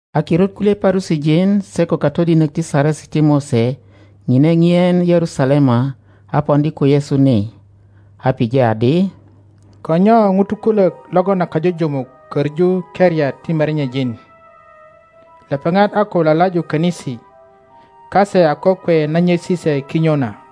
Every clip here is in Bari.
A kirut kulye Parusijin se ko A katodinok ti Saresi ti Mose ŋine ŋien Yerusalema a poŋdi ko Yesu ni, a pije adi, Ko nyo ŋutu kulök logon a kajujumuk köŋu keriat ti merenyejin? Lepeŋat a ko lalaju könisi kase a kokwe na nyesi se kinyo na.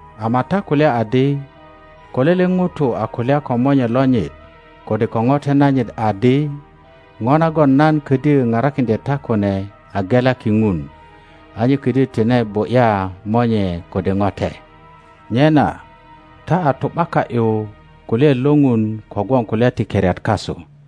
Ama ta kulya adi, Ko lele ŋuto a kulya ko monye lonyit kode ko ŋote nanyit adi, ŋo nagon nan ködyö parakiŋdye ta kune a gelaki Ŋun, a nye ködyö tine bu ’ya monye kode ŋote. Nyena ta a tu ’baka ’yu kulyaet lo Ŋun kogwon kulya ti keriat kasu.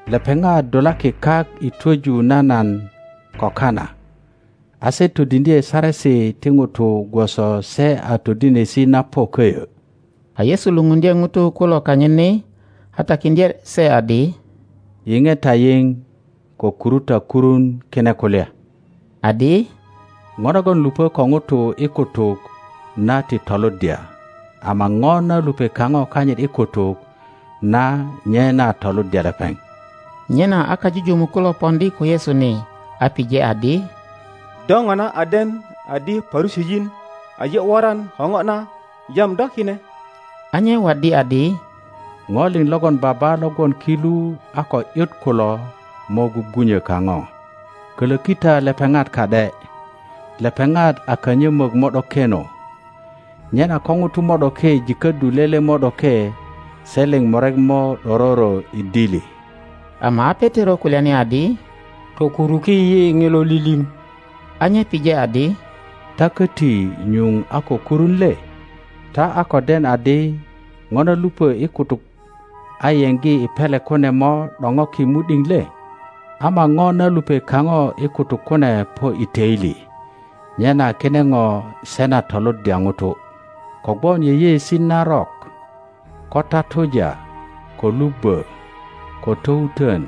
Lepeŋat dulaki kak i twöju na nan ko kana, a se todiŋdye saresi ti ŋutu gwoso se a todinesi na po köyö. A Yesu lupundye ŋutu kulo kanyit ni, a takiŋdye se adi, Yiŋe ta yiŋ, ko kuru ta kurun kine kulya, adi, ŋo nagon lupö ko ŋuto i kutuk na ti toluddya, ama ŋo na lupe kaŋo kanyit i kutuk na nye na toluddya lepeŋ. Nyena a kajujumuk kulo poŋdi ko Yesu ni, a pije adi, Do ŋona a den adi Parusijin aje woran ko ŋo na jam do kine? A nye waddi adi, ŋo liŋ logon Baba lo gwon ki lu a ko ’yut kulo mo gwugwu-nyo kaŋo. Kölöki ta lepeŋat ka ’de. Lepeŋat a kanyömök mo ’dokeno. Nyena ko ŋuto mo ’doke jiköddu lele mo’doke, se liŋ murek mo ’dororo i dili. Ama a Petero kulyani adi, Tokuruki yi ŋilo lilim. A nye pije adi, Ta köti nyuŋ a ko kurun le? Ta a ko den adi ŋo na lupö i kutuk a yeŋgi i pele kune mo ’doŋoki mu ’diŋ le? Ama ŋo na lupe kaŋo i kutuk kune po i töili, nyena kine ŋo se na toluddya ŋuto. Kogwon yeyeesi narok, ko tatuja, ko lubbö, ko towutön,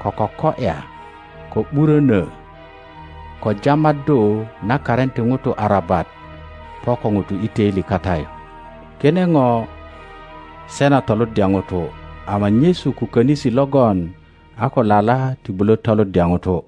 ko koko ’ya, ko ’burönö, ko jamaddu na karin ti ŋutu arabat po ko ŋuto i toili kata yu. Kine ŋo se na toluddya ŋuto, ama nyesu ko konisi logon a ko lala ti bulö toluddya ŋuto.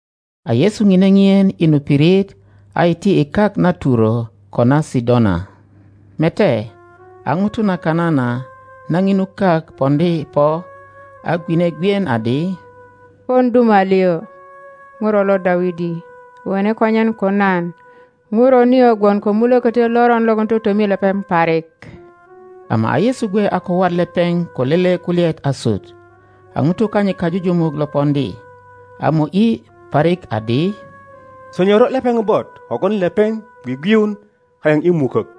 A Yesu ŋine ŋien i nu pirit a iti i kak na Turo ko na Sidona. Mete, aŋuto na Kanana na ŋinu kak poŋdi po, a gwine gwien adi, Pon duma liŋ, ŋuro lo Dawidi, wone konyen ko nan. ŋuro nio gwon ko mulökötyo loron logon totomi lepeŋ parik. Ama a Yesu gwe a ko wat lepeŋ ko lele kulyaet asut. A ŋutu kanyit kajujumuk lo poŋdi, a mo ’yi parik adi, Sonyoro lepeŋ bot, kogwon lepeŋ gwigwiun kayaŋ i mukok.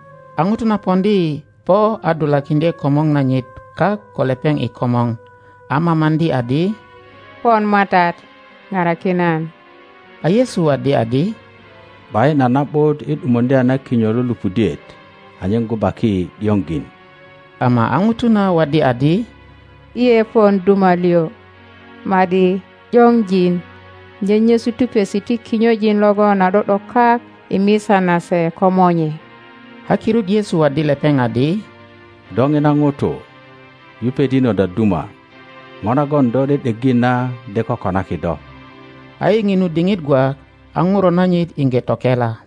a ŋuto na poŋdi po a dulakiŋdye komor nanyit kak ko lepeŋ i komor, a mamaŋdi adi, Pon matat, paraki nan. a Yesu waddi adi, ’Bayin a na ’but i ’dumuŋdya na kinyo lo lupudiet anyen gubaki ’dioŋjin. Ama a ŋuto na waddi adi, lye pon duma liŋ, ma ’di ’diŋojin nyenyesu tupesi ti kinyojin logon a do ’do kak i misa nase komonye. A kirut Yesu waddi lepeŋ adi, Do oma ŋuto, yupet inot a duma; ŋo nagon do ’de ’depi na de kokonaki do. A i ŋinu diŋit gwak a ŋuro nanyit iŋge tokela.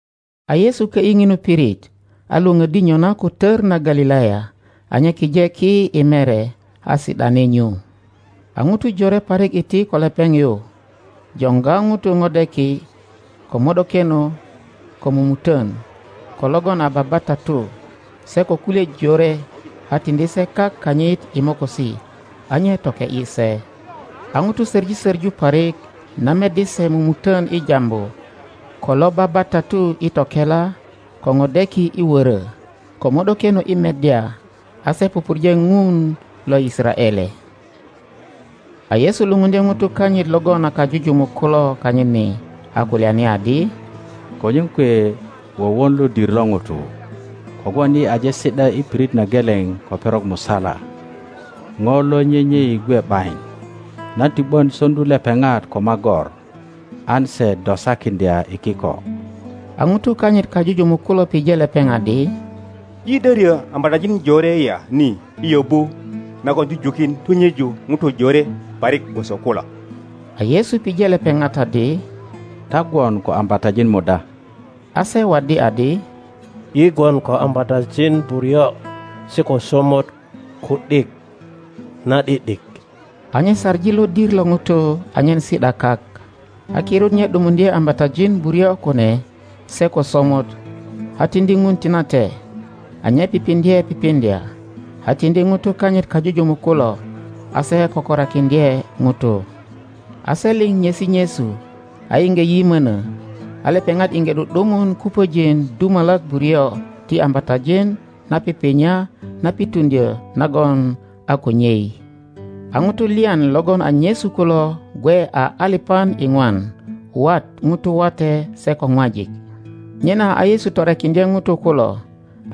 A Yesu kö ’yi ŋinu pirit, a Iwoŋöddi nyona ko tör na Galilaya, a nye kije ki i mere, a si ’dani nyu. a ŋutu jore parik iti ko lepeŋ yu, joŋga ŋutu ŋodeki, ko mo ’dokeno, ko mumutön, ko logon a babatatu, se ko kulye jore, a tiŋdi se kak kanyit i mokosi, a nye toke ’yi se. A ŋutu soŋi soŋu parik na meddi se mumuton i jambu, ko lo babatatu i tokela, ko ŋodeki i wörö, ko mo ’dokeno i meddya; a so pupurje Ŋun lo Yisaraele. A Yesu lupundye ŋutu kanyit logon a kajujumuk kulo kanyit ni, a kulyani adi, Konyen kwe wowon lodir lo ŋutu, kogwon yi aje si ’da i pirit na geleŋ ko perok musala, ŋo lo nyenyei gwe ’bayin. Nan ti ’bön soŋdu lepeŋat ko magor an se dosakiŋdya i kiko. A ŋutu kanyit kajujumuk kulo pije lepeŋ adi, Yi de ryö ambatajin jore ya ni i yöbu nagon jujukin tunyeji ŋutu jore parik gwoso kulo? a Yesu pije lepeŋat adi, Ta gwon ko ambatajin muda? A se waddi adi, Yi gwon ko ambatajin buryo se ko somot ku ’dik na ’dik ’dik. a nye saŋi lodir lo ŋutu anyen si ’da kak, a kirut nye ’dumuŋdye ambatajin buryo kune se ko somot, a tiŋdi Ŋun tinate, a nye pipiŋdye pipiŋdya, a tiŋdi ŋutu kanyit kajujumuk kulo, a se kökorakiŋdye ŋutu. a se liŋ nyesi nyesu, a iŋge yimöno, a lepeŋat iŋge ’du ’dumun kupöjin dumalak buryo ti ambatajin na pipinya na pituŋdyö nagon a ko nyei. a ŋutu lyan logon a nyesu kulo gwe a alipan iŋwan, wat ŋutu wate se ko ŋwajik. Nyena a Yesu torekiŋdye ŋutu kulo,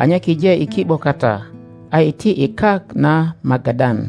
a nye kije i ki ’bo kata, a iti i kak na Magadan.